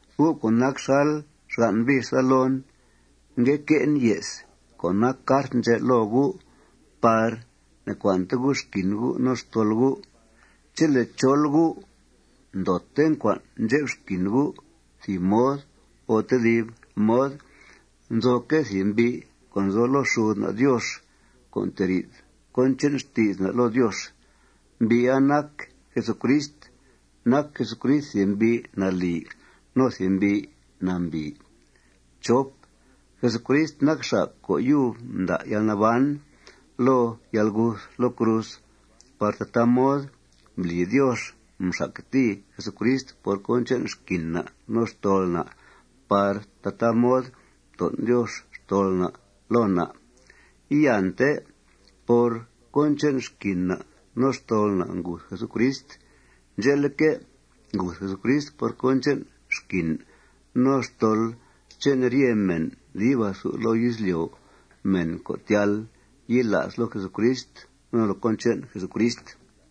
Gu' co' nac xal xgan' bix daa loon, ngue que'en ye's co' nac cart ndxè' loo gu' par ne'cua'nte gu' xquin gu' no xtol gu'. Chele' chol gu' ndoote ncua'n ndxep xquin gu' thìb mod o tedib mod, nzoque' thìb mbi' co' nzo loo xud na' Diox co' nteri'th cón che'n xti's na' loo Diox. Mbi'a nac Jesucrist. Nac Jesucrist thìb mbi' nalì no thìb mbi' nambìi. Jesucrist nac xa' co' yub mda' yalnaban loo yalguth loo cruz par tataa mod mbli Diox mxactìi Jesucrist por cón che'n xquin na' no xtol na' par tataa mod mton' Diox xtol na' loo na'. Iante por cón che'n xquin na' no xtol na' nguth Jesucrist. Ndxe'leque', nguth Jesucrist por cón che'n xquin no xtol che'n ryete mèn dib athu izlyo', mèn co' tyal yila's loo Jesucrist no loo cón che'n Jesucrist.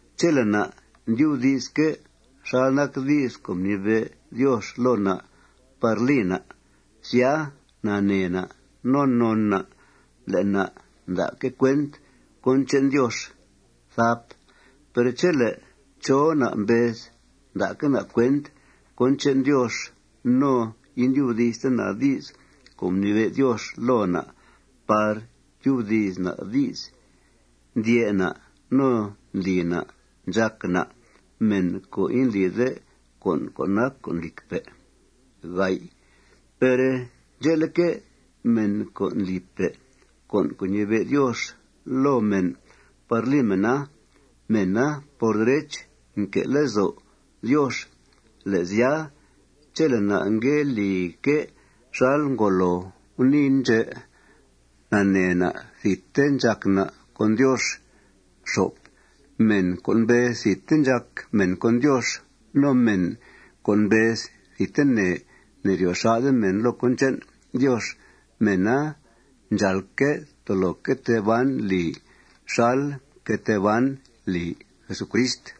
Chele' na' ndyubdi'sque' xal nac di's co' mnibe' Diox loo na' par li na', sya, nanee na' no non na' le' na' nda'que' cuent cón che'n Diox. Per chele' chó na' mbez nda'que' na' cuent cón che'n Diox no indyubdi'ste na' di's co' mnibe' Diox loo na' par tyubdi's na' di's, ndyè' na' no ndli na' ndxàc na' mèn co' indlide con' co' nac con' lìcpe'. Per ndxe'leque', mèn co' ndlipe' con' co' ñibe' Diox loo mèn par li mèna, mèna, por derech, nque' lezo' Diox. Le' sya, chele' na' ngue lique' xal ngolo guniin ndxè', nanee na' thidte ndxàc na' con Diox. Mèn co' mbez thidte ndxàc mèn con Diox, no mèn co' mbez thidtene ne'ryo xà'de mèn loo cón che'n Diox, mèna ndxàalque' tolo que tee ban li xal mque tee ban li Jesucrist.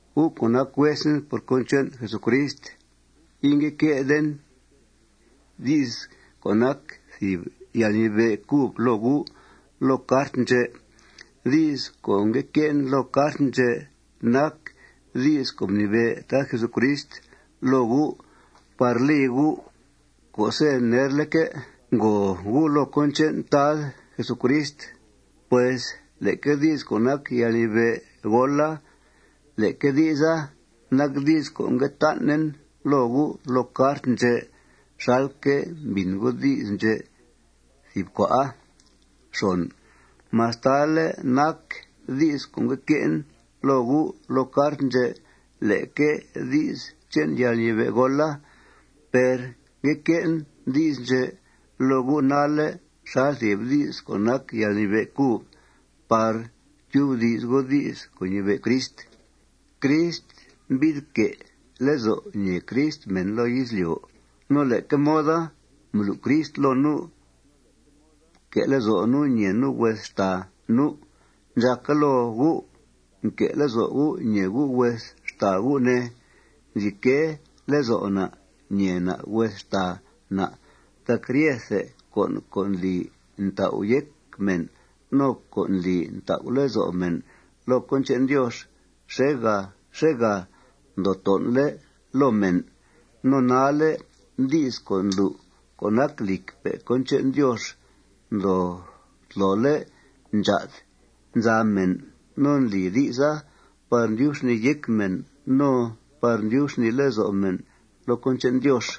Gu' co' nac huesen por cón che'n Jesucrist, ingue que'den di's co' nac thìb yalnibe' cub loo gu' loo cart ndxè'. Di's co' ngue que'en loo cart ndxè' nac di's co' mnibe' Tad Jesucrist loo gu' par li gu' co'se' nerleque' ngòo gu' loo cón che'n Tad Jesucrist. Pues leque di's co' nac yalnibe'goola, leque di'sa nac di's co' ngue tan'en loo gu' loo cart ndxè' xalque' mbìn gu' di's ndxè' thìb cua'a. Mastale' nac di's co' ngue que'en loo gu' loo cart ndxè' leque di's che'n yalñibe'goola, per ngue que'en di's ndxè' loo gu' nalle' xal thìb di's co' nac yalñibe' cub par tyubdi's gu' di's co' ñibe' Crist. Crist mbi'th que' lezo' ñèe Crist mèn loo izlyo'. No leque moda mblu' Crist loo nu' que' lezo' nu' ñèe nu' hues xtàa nu'. Ndxàca loo gu' nque' lezo' gu' ñèe gu' hues xtàa gu', ne. Nzi que' lezo' na' ñèe na' hues xtàa na' tac ryethe con' co' ndli ntau' yéc mèn no co' ndli ntau' lezo' mèn loo cón che'n Diox xèegà xèegà ndoo ton'le' loo mèn. No nalle' di's co' ndlu' co' nac lìcpe' cón che'n Diox ndoo tlole' ndxaa'd nza mèn no ndli di'sa par ndyub xnìi yéc mèn no par ndyub xnìi lezo' mèn loo cón che'n Diox.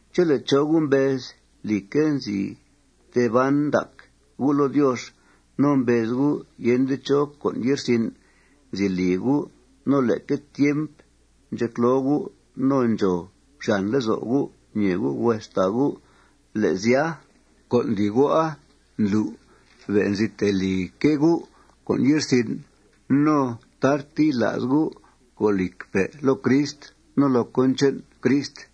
Chele' chó gu' mbez, lìcque', nzi tee ban ndac gu' loo Diox no mbez gu' yende chó con' ye'rsin' nzi li gu', no leque tiemp ndxecloo gu' no ndxòo xyàn lezo' gu' ñèe gu' hues xtàa gu', le' sya, con' ndli gu'a ndlu' be' nzi tee lique' gu' con' ye'rsin' no tarte yila's gu' co' lìcpe' loo Crist no loo cón che'n Crist.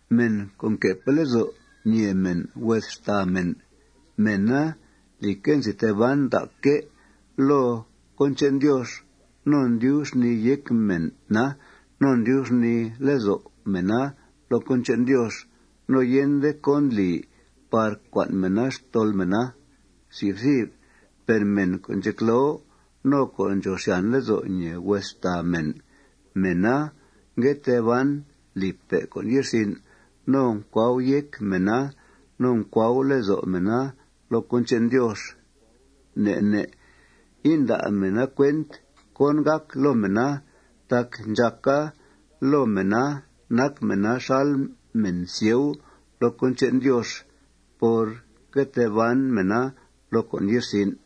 Mèn co' nque'pe' lezo' ñèe mèn hues xtàa mèn, mèna, lìcque', nzi tee ban ndacque' loo cón che'n Diox no mdyub xnìi yéc mèna no mdyub xnìi lezo' mèna loo cón che'n Diox. No yende cón ndli par cua'n mèna xtol mèna. Per mèn co' ndxecloo no co' ndxòo xyàn lezo' ñèe hues xtàa mèn, mèna ngue tee ban lipe' con' ye'rsin' no ncuau yéc mèna no ncuau lezo' mèna loo con' che'n Diox. Ne' ne' inda' mèna cuent cón gàc loo mèna tac ndxàca loo mèna nac mèna xal mèn sieu loo cón che'n Diox por ngue tee ban mèna loo con' ye'rsin'.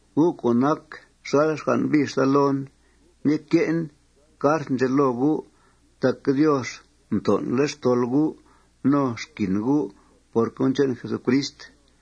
Gu' co' nac xal xgan' bix daa loon, ngue que'en cart ndxè' loo gu' tac Diox mton'le' xtol gu' no xquin gu' por cón che'n Jesucrist.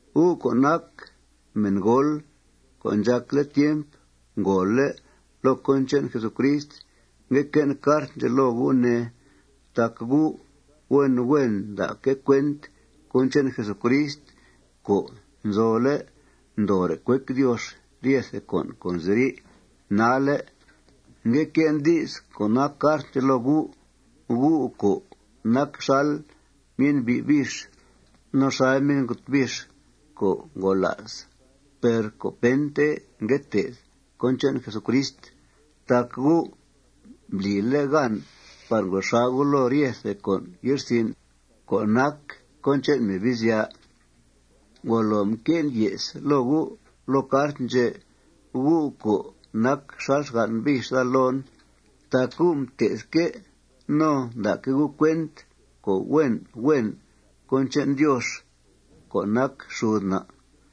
Gu' co' nac mèngool co' ndxàcle' tiemp ngòole' loo cón che'n Jesucrist, ngue que'en cart ndxè' loo gu', ne, tac gu' huen huen nda'que' cuent cón che'n Jesucrist co' nzole' ndoore' cuec Diox ryethe con' co' nziri' nalle'. Ngue que'en di's co' nac cart ndxè' loo gu', gu' co' nac xal myen'bi' bix no xal myen'got bix co' ngola's per co' pente ngue té'th cón che'n Jesucrist tac gu' mblile' gan par ngro xà' gu' loo ryethe con' ye'rsin' co' nac cón che'n Mebizya'. Ngolo mque'en ye's loo gu' loo cart ndxè', gu' co' nac xal xgan' bix daa loon, tac gu' mté'thque' no nda'que' gu' cuent co' huen huen cón che'n Diox co' nac xud na'.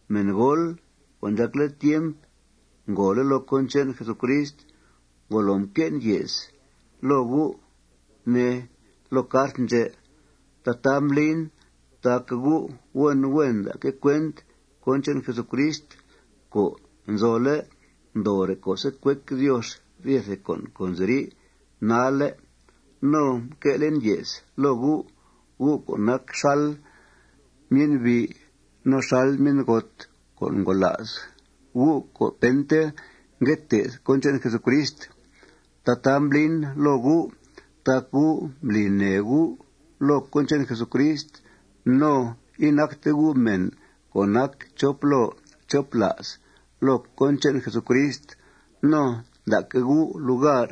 Mèngool co' ndxàcle tiemp ngòole' loo cón che'n Jesucrist, ngolo mque'en ye's loo gu', ne, loo cart ndxè'. Tataa mblin tac gu' huen huen nda'que' cuent cón che'n Jesucrist co' nzole' ndoore' co'se' cuec Diox ryethe con' co' nziri' nalle'. No mque'len ye's loo gu', gu' co' nac xal myen'bi' no xal myen'got co' ngola's, gu' co' pente ngue té'th cón che'n Jesucrist. Tataa mblin loo gu' tac gu' mbli nèe gu' loo cón che'n Jesucrist no inacte gu' mèn co' nac chop loo chop la's loo cón che'n Jesucrist. No mda'que' gu' lugar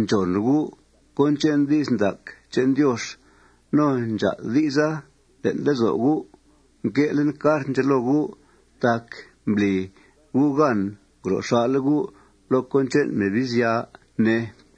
ndxòn gu' cón che'n di's ndac che'n Diox. No ndxaa'd di'sa le'n lezo' gu'. Mque'len cart ndxè' loo gu' tac mbli gu' gan ngro xà'le' gu' loo cón che'n Mebizya, ne.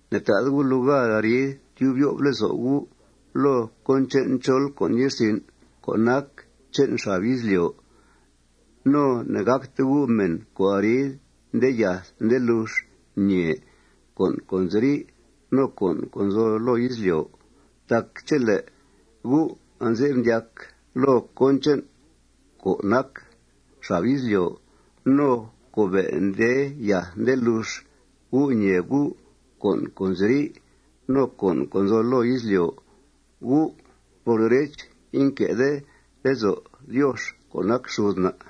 Ne'ta'de gu' lugar arid tyub yo'f lezo' gu' loo cón che'n chol con' ye'rsin' co' nac che'n xab izlyo'. No ne'gàcte gu' mèn co' arid nde yath nde lux ñèe con' co' nziri' no con' co' nzo loo izlyo'. Tac chele' gu' anze'f ndyac loo cón che'n co' nac xab izlyo' no co' be' nde yath nde lux gu' ñèe gu' con' co' nziri' no con' co' nzo loo izlyo', gu' por derech, inque'de lezo' Diox co' nac xud na'.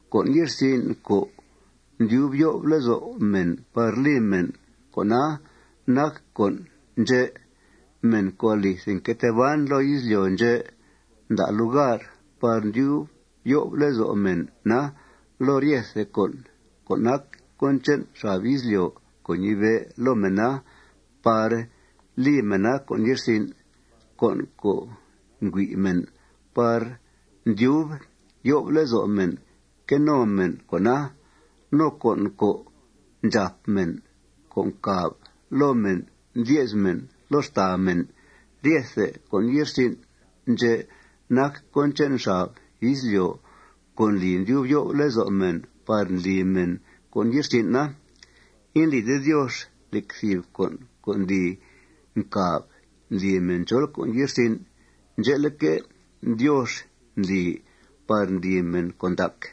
Con' ye'rsin' co' ndyub yo'f lezo' mèn par li mèn, con'a nac con' ndxè': Mèn co' alithe nque tee ban loo izlyo' ndxè' nda' lugar par ndyub yo'f lezo' mèna loo ryethe con' co' nac cón che'n xab izlyo' co' ñibe' loo mèna par li mèna con' ye'rsin'; con' co' ngüi' mèn par ndyub yo'f lezo' mèn que no mèn con'a; no con' co' ndxàp mèn co' ncàb loo mèn ndye's mèn loo xtàa mèn. Ryethe con' ye'rsin' ndxè' nac cón che'n xab izlyo' co' ndli ndyub yo'f lezo' mèn par ndli mèn con' ye'rsin'a. Indlide Diox nec thìb con' co' ndli ncàb ndli mèn chol con' ye'rsin. Ndxe'leque', Diox ndli par ndli mèn con' ndac.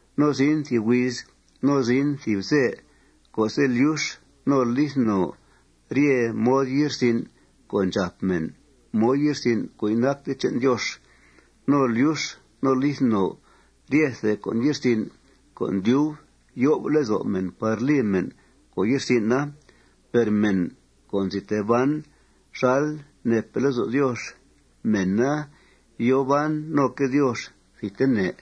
No zin thìb huiz no zin thìb ze co'se' lyux no lith no rye mod ye'rsin' co' ndxàp mèn, mod ye'rsin' co' inacte che'n Diox. No lyux no lith no ryethe con' ye'rsin' co' ndyub yo'f lezo' mèn par li mèn con' ye'rsin'a. Per mèn co' nzi tee ban xal neepe' lezo' Diox, mèna yòo ban noque' Diox thidtene.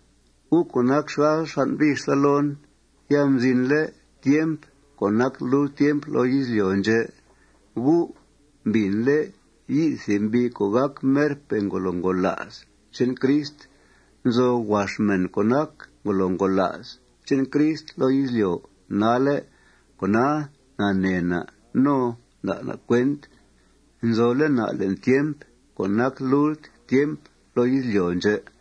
Gu' co' nac xal xgan' bix daa loon, ya mzinle' tiemp co' nac lult tiemp loo izlyo' ndxè'. Gu' mbìnle' yi'th thìb mbi' co' gàc merpe' ngolo ngola's che'n Crist. Nzo huax mèn co' nac ngolo ngola's che'n Crist loo izlyo' nalle'. Cona, nanee na' no nda' na' cuent nzole' na' le'n tiemp co' nac lult tiemp loo izlyo' ndxè'.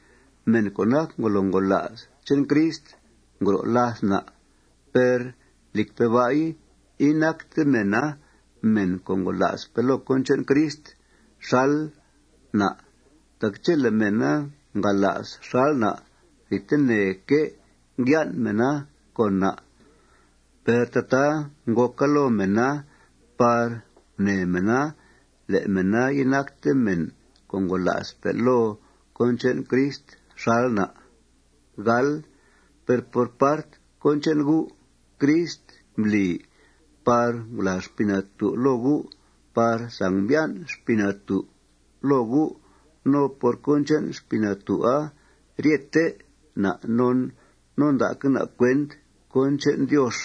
Mèn co' nac ngolo ngola's che'n Crista ngro' làth na'. Per, lìcpe' ba'i, inacte mèna mèn co' ngola'spe' loo cón che'n Crist xal na'. Tac chele' mèna ngala's xal na', thidteneque' ngyan' mèna con na'. Per tataa ngòca loo mèna par gunèe mèn le' mèna inacte mèn co' ngola'spe' loo cón che'n Crist xal na'. Per por part cón che'n gu', Crist mbli par ngulàa Xpii Natú' loo gu' par sangmbyan' Xpii Natú' loo gu'. No por cón che'n Xpii Natú'a, ryete na' non no nda'que' na' cuent cón che'n Diox.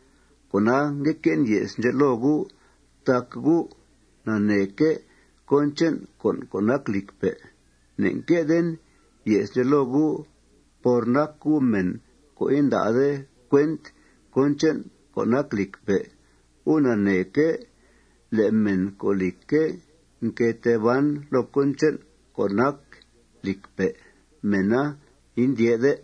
Cona, ngue que'en ye's ndxè' loo gu' tac gu' naneeque' cón che'n con' co' nac lìcpe'. Ne'nque'den ye's ndxè' loo gu' por nac gu' mèn co' inda'de cuent cón che'n co' nac lìcpe'. Gu' naneeque' le' mèn co', lìcque', nque tee ban loo cón che'n co' nac lìcpe', mèna indyè'de.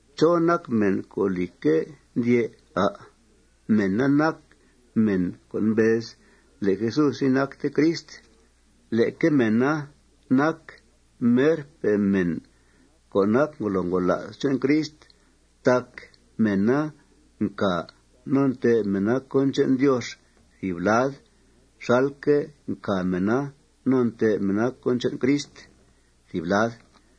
¿Chó nac mèn co', lìcque', ndyè', à'? Mèna nac mèn co' mbez le' Jesús inacte Crist. Leque mèna nac merpe' mèn co' nac ngolo ngola's che'n Crist tac mèna ncà no ntè'b mèna cón che'n Diox thìb lad xalque' ncà mèna no ntè'b mèna cón che'n Crist thìb lad.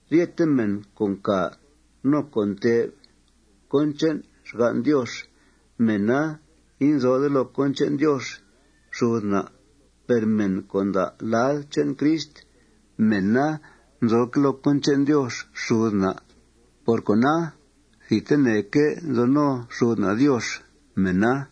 Ryete mèn co' ncà no co' ntè'b cón che'n xgan' Diox, mèna inzode loo cón che'n Diox xud na'. Per mèn co' nda' lad che'n Crist, mèna nzoque' loo cón che'n Diox xud na'. Por cona, thidteneque' nzo no xud na' Diox mèna.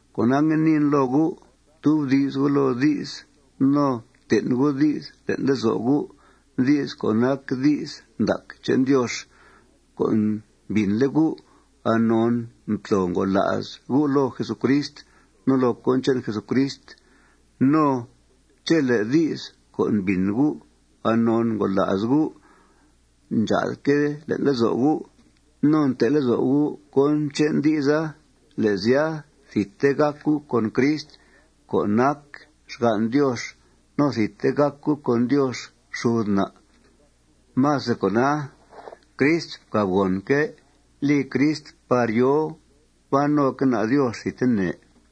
Cona, ngue niin loo gu': Ftubdi's gu' loo di's no ften' gu' di's le'n lezo' gu', di's co' nac di's ndac che'n Diox co' mbìnle' gu' anon mtlo ngola's gu' loo Jesucrist no loo cón che'n Jesucrist. No chele' di's co' mbìn gu' anon ngola's gu' ndxaa'dque' le'n lezo' gu' no nte' lezo' gu' cón che'n di'sa, le' sya, thidte gàc gu' con Crist co' nac xgan' Diox no thidte gàc gu' con Diox xud na'. Más de cona, Crist mcàbgònque' li Crist par yòo ban noque' na' Diox thidtene.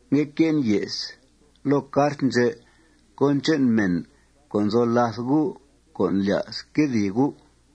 Ngue que'en ye's loo cart ndxè' cón che'n mèn co' nzo làth gu' co' ndlya's quedìi gu'.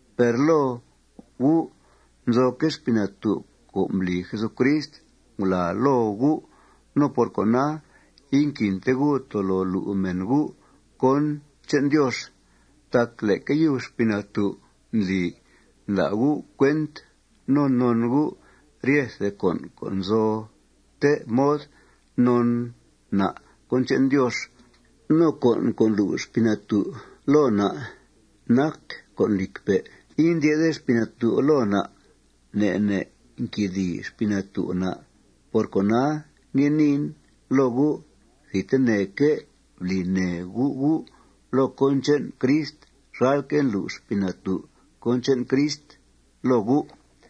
Per loo gu' nzoque' Xpii Natú' co' mbli Jesucrist ngulàa loo gu'. No por cona, inquinte gu' tolo lu' mèn gu' cón che'n Diox. Tac leque yub Xpii Natú' ndli nda' gu' cuent no non gu' ryethe con' co' nzote mod non na' cón che'n Diox. No con' co' ndlu' Xpii Natú' loo na' nac con' lìcpe'. Indyè'de Xpii Natú' loo na'. Ne' ne' nquedìi Xpii Natú' na'. Por cona, ngue niin loo gu': Thidteneque' bli nèe gu' gu' loo cón che'n Crist xalque' ndlu' Xpii Natú' cón che'n Crist loo gu'.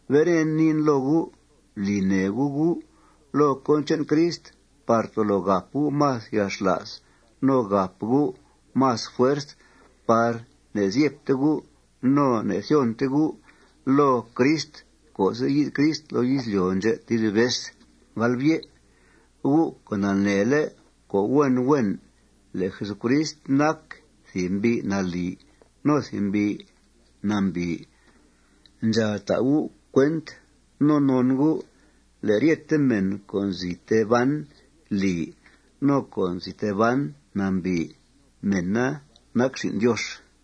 Beren, niin loo gu': Bli nèe gu' gu' loo cón che'n Crist par tolo gàp gu' más yalxla's no gàp gu' más fuerz par ne'zyebte gu' no ne'thyonte gu' loo Crist co'se' yi'th Crist loo izlyo' ndxè' tedib vez. Gu' co' naneele' co' huen huen le' Jesucrist nac thìb mbi' nalì no thìb mbi' nambìi, ndxàal ta' gu' cuent no non gu' le' ryete mèn co' nzi tee ban lì no co' nzi tee ban nambìi, mèna nac xin' Diox.